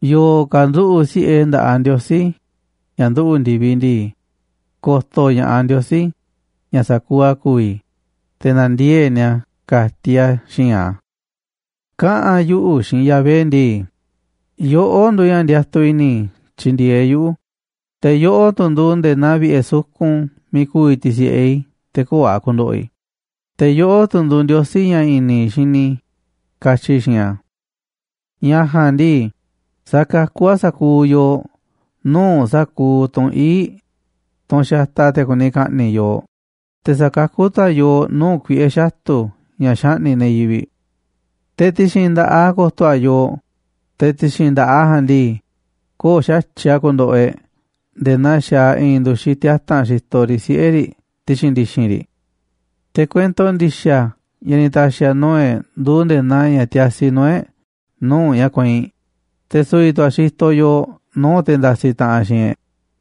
Yo̱o̱ ka̱ nduꞌu̱ꞌ si̱ꞌe nda̱ꞌaꞌ Ndiosí ña̱ nduꞌu̱ꞌ ndi̱viꞌ ndii, ko̱to̱ ña̱ꞌaꞌ Ndiosí, ña̱ sa̱kuuꞌ a̱ ku̱vi̱, te̱ na̱ndiee̱ꞌ ni̱a̱ ka̱tiꞌ a̱ xi̱i̱nꞌ a̱. Kaꞌa̱n yuꞌu̱ xiinꞌ Yahvé ndii: “Yoꞌó nduuꞌ ña̱ ndiatuꞌ i̱ni̱ i̱ tyi̱ndi̱e̱eꞌ yuꞌu̱, te̱ yoꞌó tu̱ nduuꞌ nde̱e̱ naa vi̱ꞌe̱ sukun miiꞌ ku̱vi̱ ti̱si̱ꞌe i̱ te̱ köo̱ꞌ a̱ ku̱ndo̱ꞌo̱ i̱, te̱ yoꞌó tu̱ nduuꞌ Ndiosí ña̱ i̱ni̱ i̱ xini i̱”, katyi i̱ xiinꞌ a̱. Ña̱ ja̱a̱nꞌ ndii, sa̱kakú a̱ sa̱kuuꞌ yooꞌ nuu̱ꞌ sa̱kuuꞌ tunꞌ ii̱ꞌ, tunꞌ xataꞌ te̱ kuni ka̱ꞌni̱ꞌ yooꞌ, te̱ sa̱kakú tu̱ a̱ yooꞌ nuu̱ꞌ kuiꞌe̱ xatu̱ ña̱ xaꞌni̱ꞌ ne̱ yivi̱ꞌ. Te̱ ti̱xi̱n nda̱ꞌaꞌ a̱ ko̱to̱ a̱ yooꞌ, te̱ ti̱xi̱n nda̱ꞌaꞌ a̱ ja̱a̱nꞌ ndii, köo̱ꞌ xa̱tyiꞌ a̱ ku̱ndo̱ꞌo̱ e̱ꞌ nde̱e̱ naa xaaꞌ i̱i̱n ndu̱xiꞌ tiata̱nꞌ xitoꞌ riꞌ siꞌe̱ riꞌ ti̱xi̱n ndi̱xi̱n riꞌ. Te̱ kuento ndi̱xa̱ ña̱ ni̱ ta̱xi̱ a̱ nuu̱ꞌ e̱ꞌ nduuꞌ nde̱e̱ naa ña̱ tiasi nuu̱ꞌ e̱ꞌ nuu̱ꞌ ña̱ kueinꞌ, te̱ su̱vi̱ tu̱ a̱ xitoꞌ yooꞌ nuu̱ꞌ te̱ ndasiꞌ taꞌanꞌ xiinꞌ e̱ꞌ.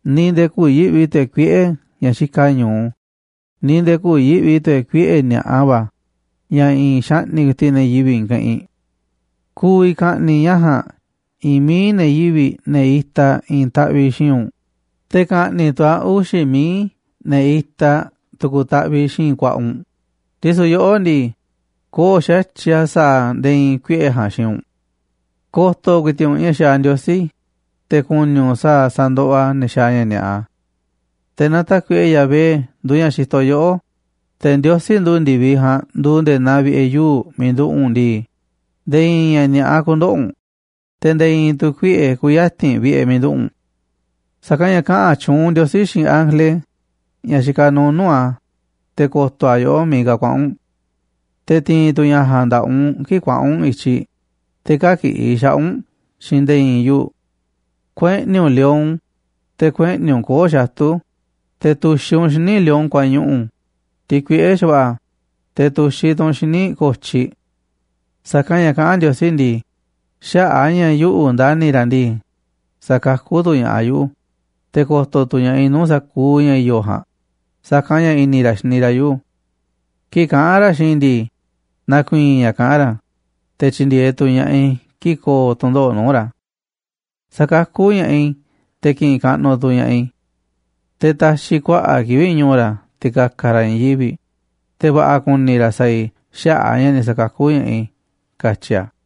Ni̱ nde̱e̱ kü̱yi̱ꞌvi tu̱ e̱ꞌ kuiꞌe̱ ña̱ xikaꞌ ñu̱u, ni̱ nde̱e̱ kü̱yi̱ꞌvi tu̱ e̱ꞌ kuiꞌe̱ ni̱a̱ꞌa va̱, ña̱ i̱i̱n xaꞌni̱ꞌ ku̱i̱ti̱ꞌ ne̱ yivi̱ꞌ i̱i̱n keꞌinꞌ. Ku̱vi̱ ka̱ꞌni̱ꞌ ña̱ ja̱a̱nꞌ i̱i̱n mií ne̱ yivi̱ꞌ, ne̱ itaꞌ i̱i̱n taꞌviꞌ xi̱i̱nꞌ u̱nꞌ, te̱ ka̱ꞌni̱ꞌ tu̱ a̱ uxi̱ mií ne̱ itaꞌ tu̱ku̱ taꞌviꞌ xiinꞌ ku̱a̱ꞌa̱ u̱nꞌ, ndisu̱ yoꞌó ndii, köo̱ꞌ xa̱tyiꞌ a̱ sa̱a̱ nde̱e̱ i̱i̱n kuiꞌe̱ ja̱a̱nꞌ xiinꞌ u̱nꞌ. Ko̱to̱ ku̱i̱ti̱ꞌ u̱nꞌ ña̱ xaaꞌ Ndiosí, te̱ ku̱ni̱ u̱nꞌ sa̱a̱ sa̱ndoꞌoꞌ a̱ ne̱ xaaꞌ ña̱ ni̱a̱ꞌa. Te̱ na Tákuiꞌe Yahvé nduuꞌ ña̱ xitoꞌ yoꞌó, te̱ Ndiosí nduꞌu̱ꞌ ndi̱viꞌ ja̱a̱nꞌ nduuꞌ nde̱e̱ naa vi̱ꞌe̱ yuu̱ꞌ miiꞌ nduꞌu̱ꞌ u̱nꞌ ndii, nde̱e̱ i̱i̱n ña̱ ni̱a̱ꞌa kü̱ndo̱ꞌo̱ u̱nꞌ, te̱ nde̱e̱ i̱i̱n tu̱ kuiꞌe̱ kü̱ya̱ti̱n vi̱ꞌe̱ miiꞌ nduꞌu̱ꞌ u̱nꞌ. Sa̱kanꞌ ña̱ kaꞌa̱n tyuunꞌ Ndiosí xiinꞌ ángele ña̱ xikaꞌ nuuꞌ nuu̱ꞌ a̱, te̱ ko̱to̱ a̱ yoꞌó miiꞌ ka̱ kuaꞌa̱n u̱nꞌ. Te̱ ti̱i̱n tu̱ ña̱ ja̱a̱nꞌ nda̱ꞌaꞌ u̱nꞌ kii̱ꞌ kuaꞌa̱n u̱nꞌ i̱tyiꞌ, te̱ kä̱kiꞌi̱ xaꞌa̱ꞌ u̱nꞌ xiinꞌ nde̱e̱ i̱i̱n yuu̱ꞌ. Kueꞌni̱ u̱nꞌ lion, te̱ kueꞌni̱ u̱nꞌ koo̱ꞌ xatu̱, te̱ tu̱xiꞌ u̱nꞌ xíniꞌ u̱nꞌ lion kuañuꞌu̱, tiꞌ kuiꞌe̱ xa̱va̱ꞌa̱, te̱ tu̱xiꞌ tu̱ u̱nꞌ xíniꞌ ko̱tyiꞌ. Sa̱kanꞌ ña̱ kaꞌán Ndiosí ndii: “Xaꞌa̱ꞌ a̱ ña̱ yuꞌu̱ ndani̱ ra̱ ndii, sa̱kakú tu̱ ña̱ꞌaꞌ yuꞌu̱, te̱ ko̱to̱ tu̱ ña̱ꞌaꞌ i̱ nuu̱ꞌ sa̱kuuꞌ ña̱ i̱yo̱ ja̱a̱nꞌ, sa̱kanꞌ ña̱ i̱ni̱ ra̱ xini ra̱ yuꞌu̱. Kii̱ꞌ kaꞌa̱n ra̱ xiinꞌ i̱ ndii, na̱ku̱i̱i̱n i̱ ña̱ kaꞌán ra̱, te̱ tyi̱ndi̱e̱eꞌ tu̱ ña̱ꞌaꞌ i̱ kii̱ꞌ ko̱o̱ tu̱ndoꞌo̱ꞌ nuu̱ꞌ ra̱. Sa̱kakú ña̱ꞌaꞌ i̱ te̱ ki̱ꞌi̱n kaꞌnuꞌ tu̱ ña̱ꞌaꞌ i̱. Te̱ ta̱xi̱ i̱ kuaꞌa̱ꞌ kivi̱ꞌ ñu̱u̱ ra̱ te̱ ka̱ka̱ ra̱ i̱i̱n yivi̱ꞌ, te̱ va̱ꞌa̱ ku̱ni̱ ra̱ sa̱a̱ i̱ xaꞌa̱ꞌ a̱ ña̱ ni̱ sa̱kakú ña̱ꞌaꞌ i̱”, katyi a̱.